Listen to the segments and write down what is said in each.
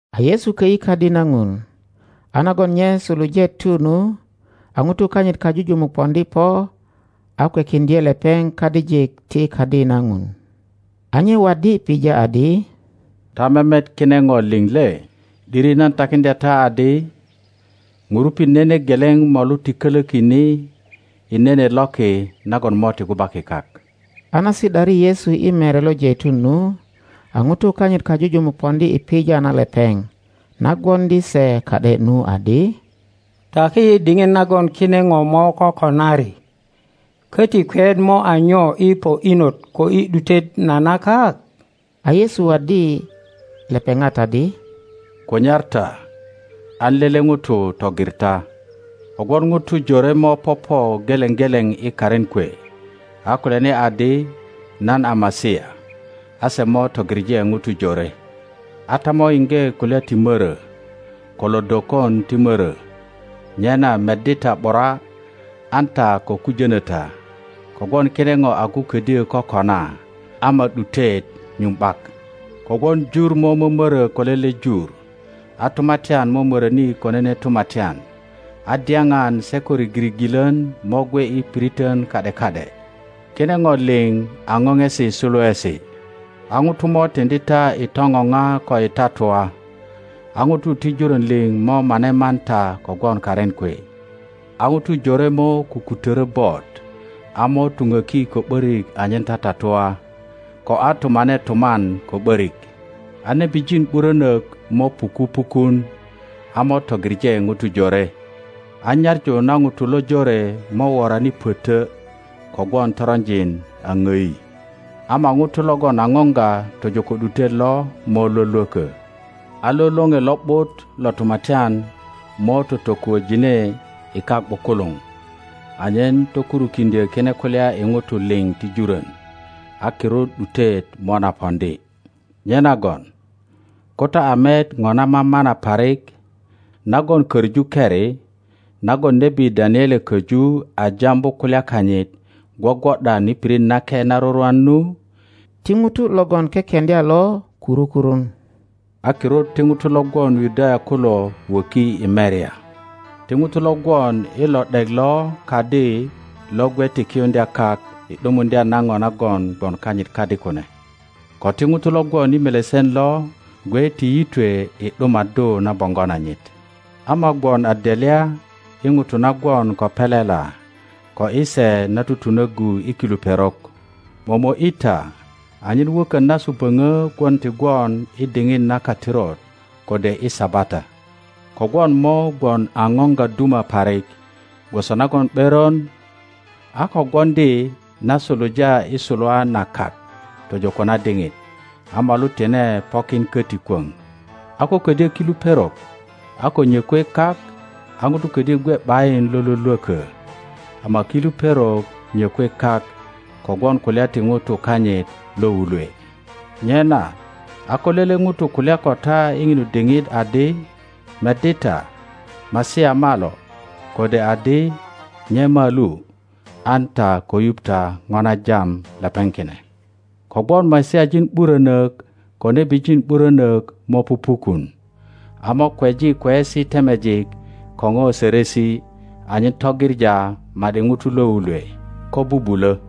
A Yesu kö ’yi Kadi na Ŋun, a nagon nye suluje tu nu, a ŋutu kanyit kajujumuk poŋdi po a kwekiŋdye lepeŋ kadijik ti Kadi na Ŋun. A nye waddi pija adi, Ta memet kine ŋo liŋ le? ’Diri nan takiŋdya ta adi, ŋurupit nene geleŋ molu ti kölöki ni i nene loki nagon mo ti gubaki kak. A na si ’dari Yesu i Mere lo Jeitun nu, a ŋutu kanyit kajujumuk poŋdi i pija na lepeŋ na gwoŋdi se ka ’de nu, adi. Taki yi diŋit nagon kine po mo kokonari, köti kweyet mo a nyo i po inot ko i ’dutet na na kak? A Yesu waddi lepeŋat adi, Kunyar ta, an lele ŋuto tugir ta. Kogwon ŋutu jore mo popo geleŋ geleŋ i karin kwe, a kulyani adi, Nan a Masia, a se mo tugiŋe ŋutu jore. A ta mo yiŋge kulya ti mörö, ko lodokon ti mörö; nyena meddi ta ’bura an ta ko kujöno ta. Kogwon kine po agu ködyö kokona, ama ’dutet nyuŋ ’bak. Kogwon jur mo mömöro ko lele jur, a tumatyan mo möröni ko nene tumatyan, a dyapan se ko rigirigilön mo gwe i piritön ka ’de ka ’de. Kine po liŋ a popesi suluesi. A ŋutu mo tiŋdi ta i topopa ko i tatua, a ŋutu ti jurön liŋ mo mane man ta kogwon karin kwe. A ŋutu jore mo kukutörö bot, a mo tupöki ko ’börik anyen tatatua, ko a tumane tuman ko ’börik. A nebijin ’burönök mo puku pukun a mo togiŋe ŋutu jore. A nyaŋu na ŋutu lojore mo worani pötö kogwon toronjin a ŋdi. Ama ŋuto logon a poŋga tojo ko ’dutet lo mo lwölwökö. A lo Loŋe Lo ’but lo Tumatyan mo totokuöjine i kak ’bukuluŋ anyen tokurukiŋdyö kine kulya i ŋutu liŋ ti jurön, a kirut ’dutet mo na poŋdi. Nyenagon ko ta a met po na mamana parik nagon köŋu keri, nagon nebi Daniele köju a jambu kulya kanyit, gwogwo ’dan i pirit nake na rurwan nu (ti ŋuto logon kekeŋdya lo kuru kurun), a kirut ti ŋutu lo gwon Yudaya kulo wöki i merya; ti ŋuto lo gwon i lo ’dek lo kadi lo gwe ti kiyuŋdya kak i ’dumaddu na po nagon kanyit kadi kune; ko ti ŋuto lo gwon i melesen lo gwe ti yitwe i ’dumaddu na boŋgo nanyit. Ama gwon a delya i ŋutu na gwon ko pelela, ko i se na tutunöggu i kilu perok! Momo ’yi ta anyen wökön nasu böŋö gwon ti gwon i diŋit na katirut kode i Sabata. Kogwon mo gwon a poŋga duma parik, gwoso nagon ’beron a ko gwoŋdi na suluja i suluwa na kak tojo ko na diŋit, a molu tine pokin köti kwöŋ. a ko ködyö kilu perok a ko nyökwe kak, a ŋuto ködyö gwe ’bayin lo lwölwökö, ama kilu perok nyökwe kak kogwon kulya ti ŋutu kanyit lo wulwe. Nyena a ko lele ŋuto kulya ko ta i ŋinu diŋit adi, Meddi ta, Masia malo! kode adi, Nye malu! an ta ko yuŋ ta po na jam lepeŋ kine. Kogwon Masiajin ’burönök ko nebijin ’burönök mo pupukun, a mo kweji kweyesi temejik ko po sörösi, anyen tugiŋa ma ’di ŋutu lo wulwe, ko bubulö.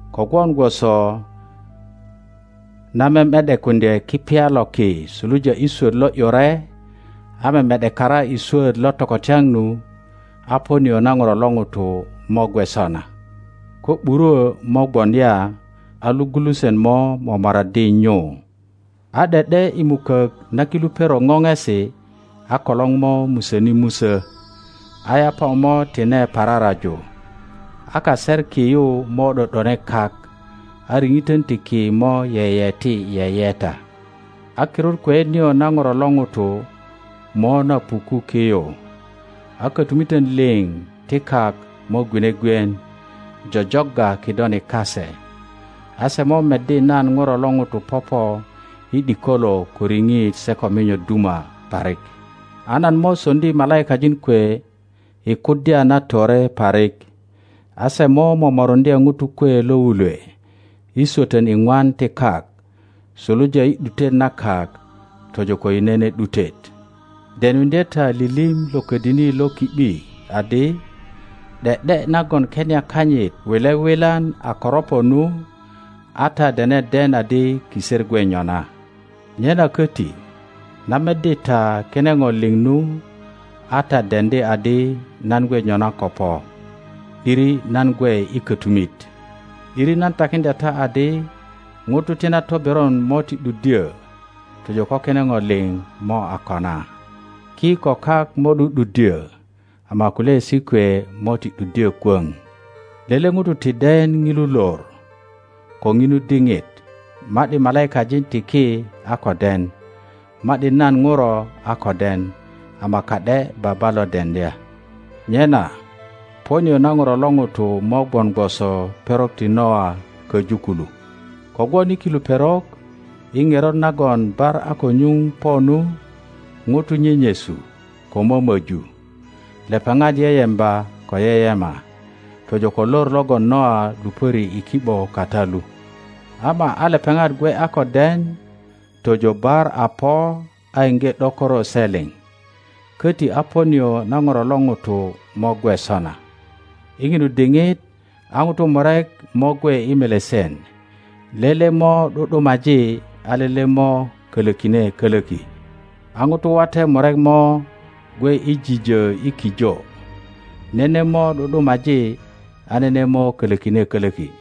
Kogwon gwoso na meme ’dekuŋdye kipya lo ki suluja i swöt lo ’yure a meme ’dekara i swöt lo tokotyaŋ nu, a po nio na Ŋuro lo ŋuto mo gwe sona. Ko ’burwo mo gwon ya, a logulusen mo momoraddi nyu. A ’de ’de i mukök na kilu perok popesi, a kolor mo musöni musö, a yapa mo tine pararaju, a kaser ki yu mo ’do ’done kak, a riŋitön ti ki mo yeyeti yeyeta. A kirut kweyet nio na Ŋuro lo ŋuto mo na puku ki yu, a kötumitön liŋ ti kak mo gwine gwien jojogga kidoni kase, a se mo meddi nan Ŋuro lo ŋuto popo i ’dikolo ko riŋit se ko minyo duma parik. A nan mo soŋdi malaikajin kwe i kuddya na tore parik, a se mo momoruŋdye ŋutu kwe lo wulwe i swötön iŋwan ti kak, suluja i ’dutet na kak tojo i nene ’dutet. Denuŋdye ta lilim lo ködini lo ki ’bi adi, ’de ’de nagon kenia kanyit wile wilan a koropo nu, a ta dene den adi kiser gwe nyona. Nyena köti, na meddi ta kine ŋo liŋ nu, a ta deŋdi adi nan gwe nyona ko po, ’diri nan gwe i kötumit. ’Diri nan takiŋdya ta adi, ŋutu ti na toberon mo ti ’duddyö tojo ko kine ŋo liŋ mo a kona. Ki ko kak mo ’du ’duddyö, ama kulyaesi kwe mo ti ’duddyö kwöŋ. Lele ŋuto ti den ŋilu lor ko ŋinu diŋit, ma ’di malaikajin ti ki a ko den, ma ’di nan Ŋuro a ko den, ama ka ’de Baba lo deŋdya. Nyena po nio na Ŋuro lo ŋuto mo gwon gwoso perok ti Noa köju kulu. Kogwon i kulu perok i ŋerot nagon bar a ko nyuŋ po nu, ŋutu nyenyesu ko mömoju, lepeŋat yeyemba ko yeyema, tojo ko lor logon Nija lupöri i ki ’bo kata lu, ama a lepeŋat gwe a ko den tojo bar a po a iŋge ’dokoro se liŋ, köti a po nio na Ŋuro lo ŋuto mo gwe sona. I ŋilu diŋit a ŋutu murek mo gwe i melesen; lele mo ’du ’dumaji, a lele mo kolökine kölöki. A ŋutu wate murek mo gwe i jijö i kijo; nene mo ’du ’dumaji, a nene mo kolökine kölöki.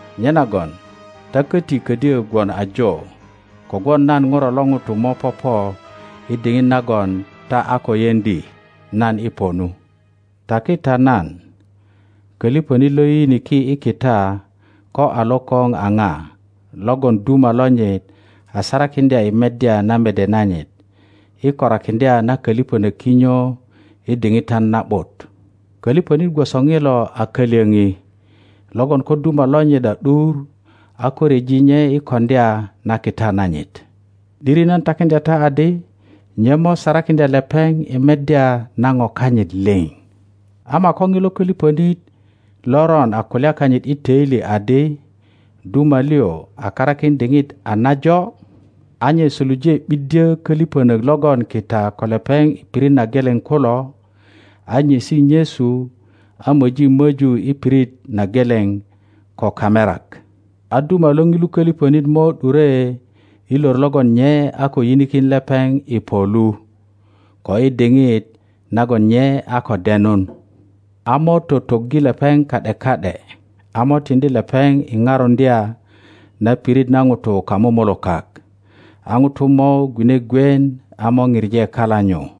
Nyenagön ta köti ködyö gwon ajo, kogwon nan Ŋuro lo ŋuto mo popo i diŋit nagon ta a ko yeŋdi nan i po nu. Taki ta nan, köliŋönit lo yiyiniki i kita ko a lokoŋ a ŋa, logon duma lonyit a sarakiŋdya i meddya na mede nanyit, i korakiŋdya na köliŋönök kinyo i diŋitan na ’but? Köliŋönit gwoso ŋilo a kalyoŋi, logon ko duma lonyit a ’dur a ko ryeji nye i koŋdya na kita nanyit. ’Diri nan takiŋdya ta adi, nye mo sarakiŋdya lepeŋ i meddya na ŋo kanyit liŋ. Ama ko ŋilo köliŋönit loron a kulya kanyit i töili adi, Duma liŋ a karakin diŋit a najo, a nye suluje ’biddyö köliŋönök logön kita ko lepeŋ i pirit na geleŋ kulo, a nyesi nyesu, a möji möju i pirit na geleŋ ko kamerak, a duma lo ŋilu köliŋönit mo ’dure i lor logon nye a ko yinikin lepeŋ i po lu, ko i diŋit nagon nye a ko denun, a mo totoggi lepeŋ ka ’de ka ’de, a mo tiŋdi lepeŋ i parundya na pirit na ŋutu kamumulukak. A ŋutu mo gwine gwien a mo pije kala nyu.